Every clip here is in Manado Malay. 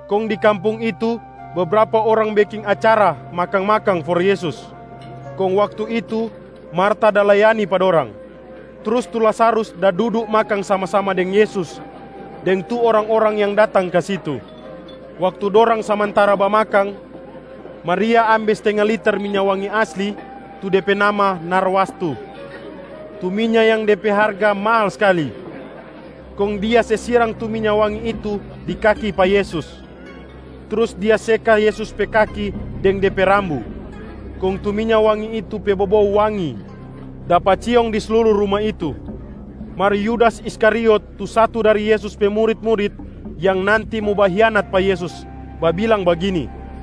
Kong di kampung itu, bebrapa orang beking acara makang-makang for Yesus. Kong Waktu itu, Marta da layani pa dorang, trus tu Lazarus da dudu makang sama-sama deng Yesus deng tu orang-orang yang datang ka situ. Waktu dorang samantara bamakang, Maria ambe stenga liter minya wangi asli tu de pe nama narwastu, tu minya yang de pe harga mahal skali. Kong dia se sirang tu minya wangi itu di kaki pa Yesus, trus dia seka Yesus pe kaki deng de pe rambu. Kong tu minya wangi itu pe bobou wangi dapa ciong di sluru ruma itu. Mar Yudas Iskariot tu satu dari Yesus pe murit-murit yang nanti mo bahianat pa Yesus babilang bagini,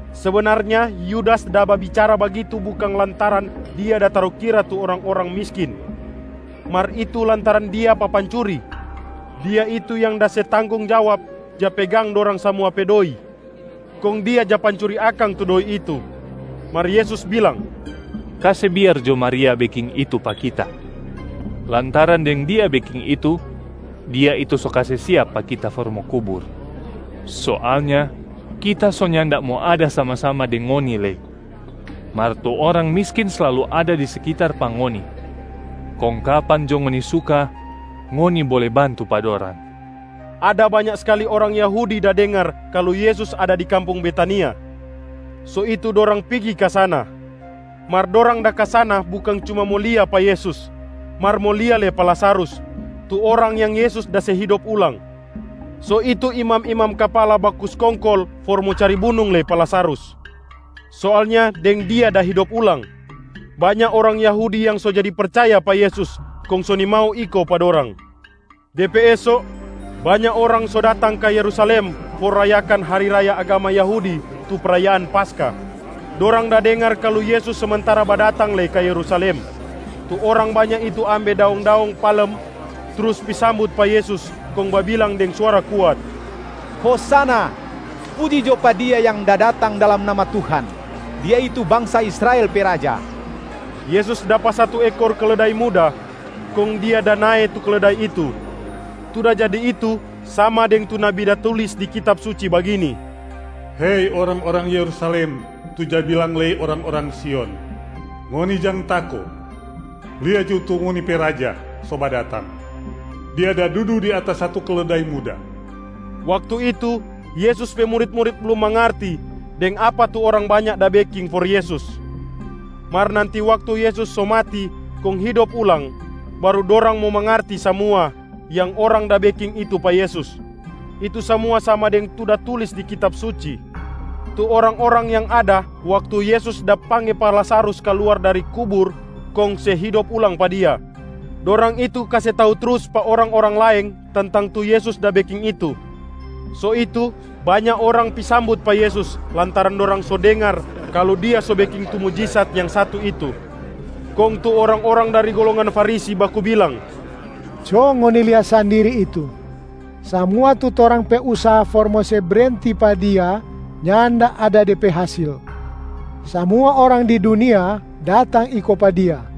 Sebenarnya Yudas da babicara bagitu bukang lantaran dia da tarukira tu orang-orang miskin, mar itu lantaran dia papancuri. Dia itu yang da se tanggong jawab ja pegang dorang samua pe doi, kong dia ja pancuri akang tu doi itu. Mar Yesus bilang, “Kase biar jo Maria beking itu pa Kita, lantaran deng dia beking itu, dia itu so kase siap pa Kita for mo kubur. Soalnya Kita so nyanda mo ada sama-sama deng ngoni lei, mar tu orang miskin slalu ada di sekitar pa ngoni kong kapan jo ngoni suka, ngoni bole bantu pa dorang.” Ada banya skali orang Yahudi da dengar kalu Yesus ada di kampung Betania, so itu dorang pigi ka sana. Mar dorang da ka sana bukang cuma mo lia pa Yesus, mar mo lia lei pa Lazarus tu orang yang Yesus da se hidop ulang. So itu imam-imam kapala baku skongkol for mo cari bunung lei pa Lazarus. Soalnya deng dia da hidop ulang, banya orang Yahudi yang so jadi percaya pa Yesus kong so nimau iko pa dorang. De pe eso, banya orang so datang ka Yerusalem for rayakan hari raya agama Yahudi tu prayaan Paskah. Dorang da dengar kalu Yesus samantara badatang lei ka Yerusalem. Tu orang banya itu ambe daong-daong palem, trus pi sambut pa Yesus kong babilang deng suara kuat, “Hosana! Puji jo pa Dia yang da datang dalam nama Tuhan. Dia itu bangsa Israel pe Raja!” Yesus dapa satu ekor keledai muda, kong Dia da nae tu keledai itu. Tu da jadi itu sama deng tu nabi da tulis di Kitab Suci bagini, “Hei orang-orang Yerusalem tu ja bilang lei orang-orang Sion, ngoni jang tako, lia jo tu ngoni pe Raja so badatang, Dia da dudu di atas satu keledai muda.” Waktu itu, Yesus pe murit-murit blum mangarti deng apa tu orang banya da beking for Yesus. Mar nanti waktu Yesus so mati kong hidop ulang, baru dorang mo mangarti samua yang orang da beking itu pa Yesus, itu samua sama deng tu da tulis di Kitab Suci. Tu orang-orang yang ada waktu Yesus da pangge pa Lazarus kaluar dari kubur kong se hidop ulang pa dia, dorang itu kase tau trus pa orang-orang laeng tentang tu Yesus da beking itu. So itu, banya orang pi sambut pa Yesus lantaran dorang so dengar kalu Dia so beking tu mujisat yang satu itu. Kong tu orang-orang dari golongan Farisi baku bilang, “Co ngoni lia sandiri itu, samua tu torang pe usaha for mo se brenti pa Dia nyanda ada de pe hasil. Samua orang di dunia datang iko pa Dia.”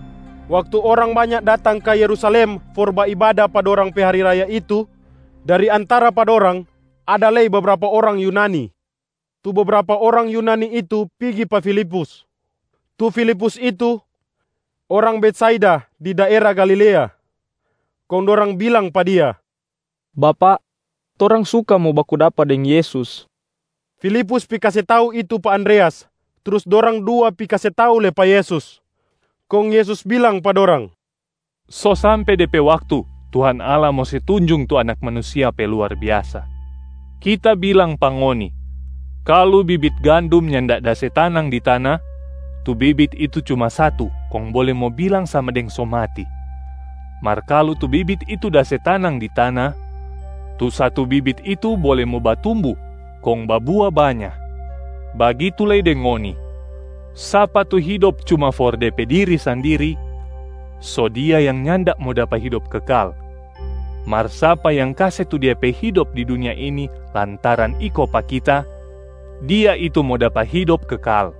Waktu orang banya datang ka Yerusalem for baibada pa dorang pe hari raya itu, dari antara pa dorang, ada lei bebrapa orang Yunani. Tu bebrapa orang Yunani itu pigi pa Filipus. Tu Filipus itu, orang Betsaida di daera Galilea. Kong dorang bilang pa dia, “Bapak, torang suka mo baku dapa deng Yesus.” Filipus pi kase tau itu pa Andreas, trus dorang dua pi kase tau lei pa Yesus. Kong Yesus bilang pa dorang, “So sampe de pe waktu Tuhan Allah mo se tunjung tu Anak Manusia pe luar biasa. Kita bilang pa ngoni, kalu bibit gandum nyanda da se tanang di tana, tu bibit itu cuma satu kong bole mo bilang sama deng so mati. Mar kalu tu bibit itu da se tanang di tana, tu satu bibit itu bole mo batumbu kong babua banya. Bagitu lei deng ngoni, sapa tu hidop cuma for de pe diri sandiri, so dia yang nyanda mo dapa hidop kekal. Mar sapa yang kase tu dia pe hidop di dunia ini lantaran iko pa Kita, dia itu mo dapa hidop kekal.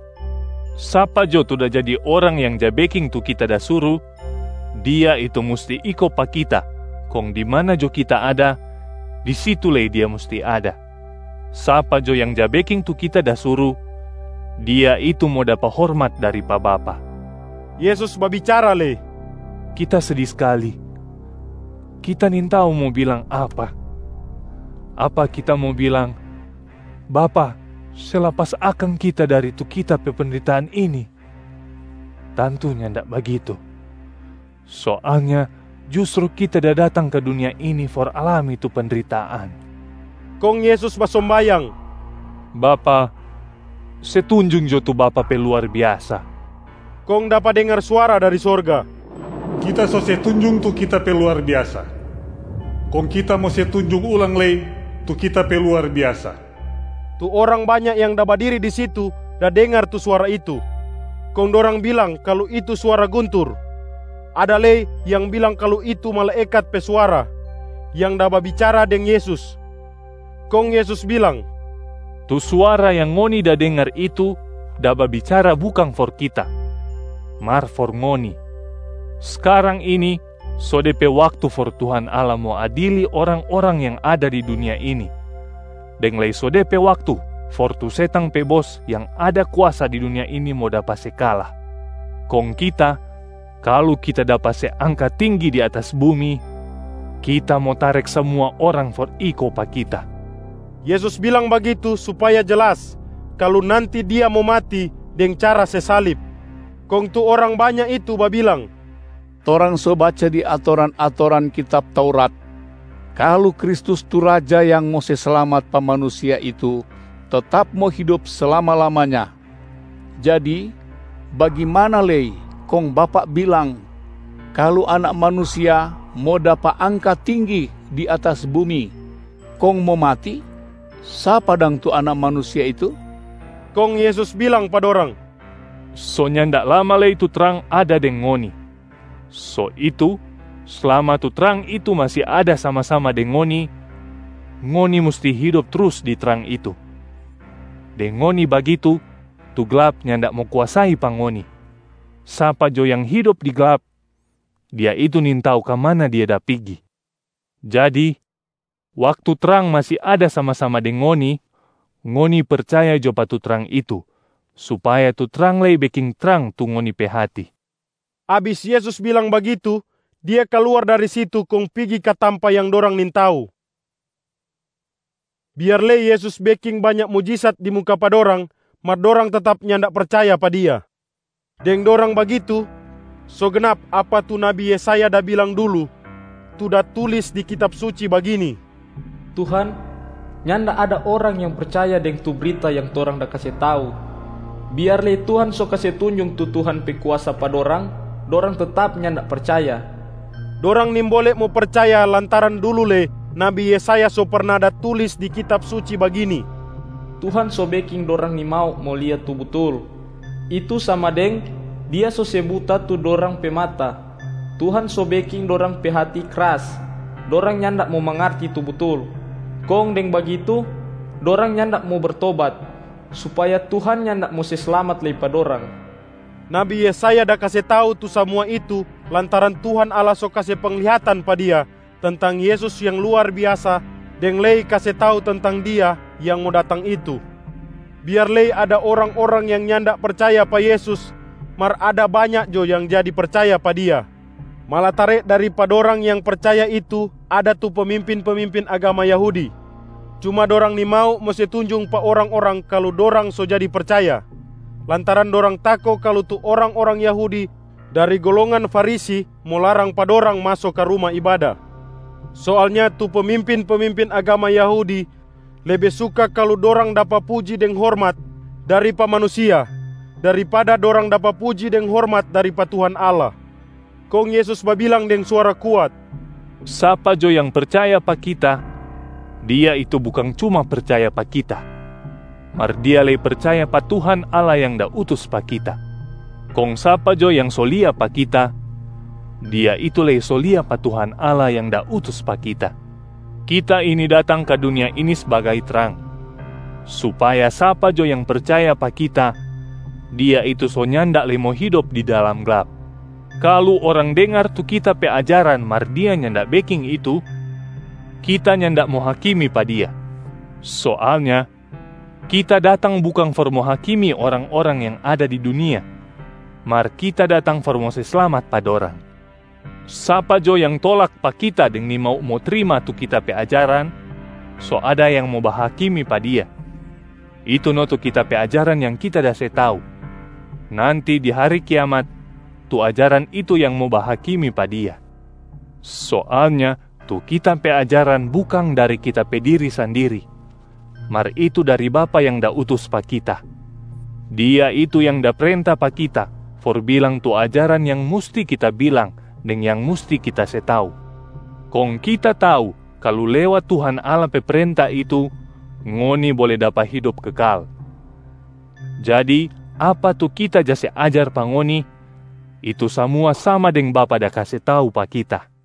Sapa jo tu da jadi orang yang ja beking tu Kita da suru, dia itu musti iko pa Kita kong di mana jo Kita ada, di situ lei dia musti ada. Sapa jo yang ja beking tu Kita da suru, dia itu mo dapa hormat dari pa Bapa.” Yesus babicara lei, “Kita sedi skali. Kita nintau mo bilang apa. Apa Kita mo bilang, ‘Bapa, se lapas akang Kita dari tu Kita pe pendritaan ini?’ Tantu nyanda bagitu. Soalnya justru Kita da datang ka dunia ini for alami tu pendritaan.” Kong Yesus basombayang, “Bapa, se tunjung jo tu Bapa pe luar biasa.” Kong dapa dengar suara dari sorga, “Kita so se tunjung tu Kita pe luar biasa, kong Kita mo se tunjung ulang lei tu Kita pe luar biasa.” Tu orang banya yang da badiri di situ da dengar tu suara itu, kong dorang bilang kalu itu suara guntur. Ada lei yang bilang kalu itu malaekat pe suara yang da babicara deng Yesus. Kong Yesus bilang, “Tu suara yang ngoni da dengar itu da babicara bukang for Kita, mar for ngoni. Skarang ini so de pe waktu for Tuhan Allah mo adili orang-orang yang ada di dunia ini, deng lei so de pe waktu for tu setang pe bos yang ada kuasa di dunia ini mo dapa se kala. Kong Kita, kalu Kita dapa se angka tinggi di atas bumi, Kita mo tarek samua orang for iko pa Kita.” Yesus bilang bagitu supaya jelas kalu nanti Dia mo mati deng cara se salib. Kong tu orang banya itu babilang, “Torang so baca di atoran-atoran kitab Taurat kalu Kristus tu Raja yang mo se slamat pa manusia itu tetap mo hidop slama-lamanya. Jadi bagimana lei kong Bapak bilang kalu Anak Manusia mo dapa angka tinggi di atas bumi kong mo mati? Sapa dang tu Anak Manusia itu?” Kong Yesus bilang pa dorang, “So nyanda lama lei tu trang ada deng ngoni, so itu slama tu trang itu masi ada sama-sama deng ngoni, ngoni musti hidop trus di trang itu. Deng ngoni bagitu, tu glap nyanda mo kuasai pa ngoni. Sapa jo yang hidop di glap, dia itu nintau ka mana dia da pigi. Jadi waktu trang masi ada sama-sama deng ngoni, ngoni percaya jo pa tu trang itu supaya tu trang lei beking trang tu ngoni pe hati.” Abis Yesus bilang bagitu, Dia kaluar dari situ kong pigi ka tampa yang dorang nintau. Biar lei Yesus beking banya mujisat di muka pa dorang, mar dorang tetap nyanda percaya pa Dia. Deng dorang bagitu, so gnap apa tu nabi Yesaya da bilang dulu tu da tulis di Kitab Suci bagini, “Tuhan, nyanda ada orang yang percaya deng tu brita yang torang da kase tau. Biar lei Tuhan so kase tunjung tu Tuhan pe kuasa pa dorang, dorang tetap nyanda percaya.” Dorang nimbole mo percaya lantaran dulu lei nabi Yesaya so perna da tulis di Kitab Suci bagini, “Tuhan so beking dorang nimau mo lia tu butul, itu sama deng Dia so se buta tu dorang pe mata. Tuhan so beking dorang pe hati kras, dorang nyanda mo mangarti tu butul. Kong deng bagitu, dorang nyanda mo bertobat, supaya Tuhan nyanda mo se slamat lei pa dorang.” Nabi Yesaya da kase tau tu samua itu lantaran Tuhan Allah so kase penglihatan pa dia tentang Yesus yang luar biasa deng lei kase tau tentang Dia yang mo datang itu. Biar lei ada orang-orang yang nyanda percaya pa Yesus, mar ada banya jo yang jadi percaya pa Dia, malatare dari pa dorang yang percaya itu ada tu pemimpin-pemimpin agama Yahudi. Cuma dorang nimau mo se tunjung pa orang-orang kalu dorang so jadi percaya, lantaran dorang tako kalu tu orang-orang Yahudi dari golongan Farisi mo larang pa dorang maso ka ruma ibada. Soalnya tu pemimpin-pemimpin agama Yahudi lebe suka kalu dorang dapa puji deng hormat dari pa manusia daripada dorang dapa puji deng hormat dari pa Tuhan Allah. Kong Yesus babilang deng suara kuat, “Sapa jo yang percaya pa Kita, dia itu bukang cuma percaya pa Kita, mar dia lei percaya pa Tuhan Allah yang da utus pa Kita. Kong sapa jo yang so lia pa Kita, dia itu lei so lia pa Tuhan Allah yang da utus pa Kita. Kita ini datang ka dunia ini sbagai trang, supaya sapa jo yang percaya pa Kita, dia itu so nyanda lei mo hidop di dalam glap. Kalu orang dengar tu Kita pe ajaran mar dia nyanda beking itu, Kita nyanda mo hakimi pa dia. Soalnya Kita datang bukang for mo hakimi orang-orang yang ada di dunia, mar Kita datang for mo se slamat pa dorang. Sapa jo yang tolak pa Kita deng nimau mo trima tu Kita pe ajaran, so ada yang mo bahakimi pa dia, itu no tu Kita pe ajaran yang Kita da se tau. Nanti di hari kiamat, tu ajaran itu yang mo bahakimi pa dia. Soalnya tu Kita pe ajaran bukang dari Kita pe diri sandiri, mar itu dari Bapa yang da utus pa Kita. Dia itu yang da prenta pa Kita for bilang tu ajaran yang musti Kita bilang deng yang musti Kita se tau. Kong Kita tau kalu lewat Tuhan Allah pe prenta itu, ngoni bole dapa hidop kekal. Jadi apa tu Kita ja se ajar pa ngoni, itu samua sama deng Bapa da kase tau pa Kita.”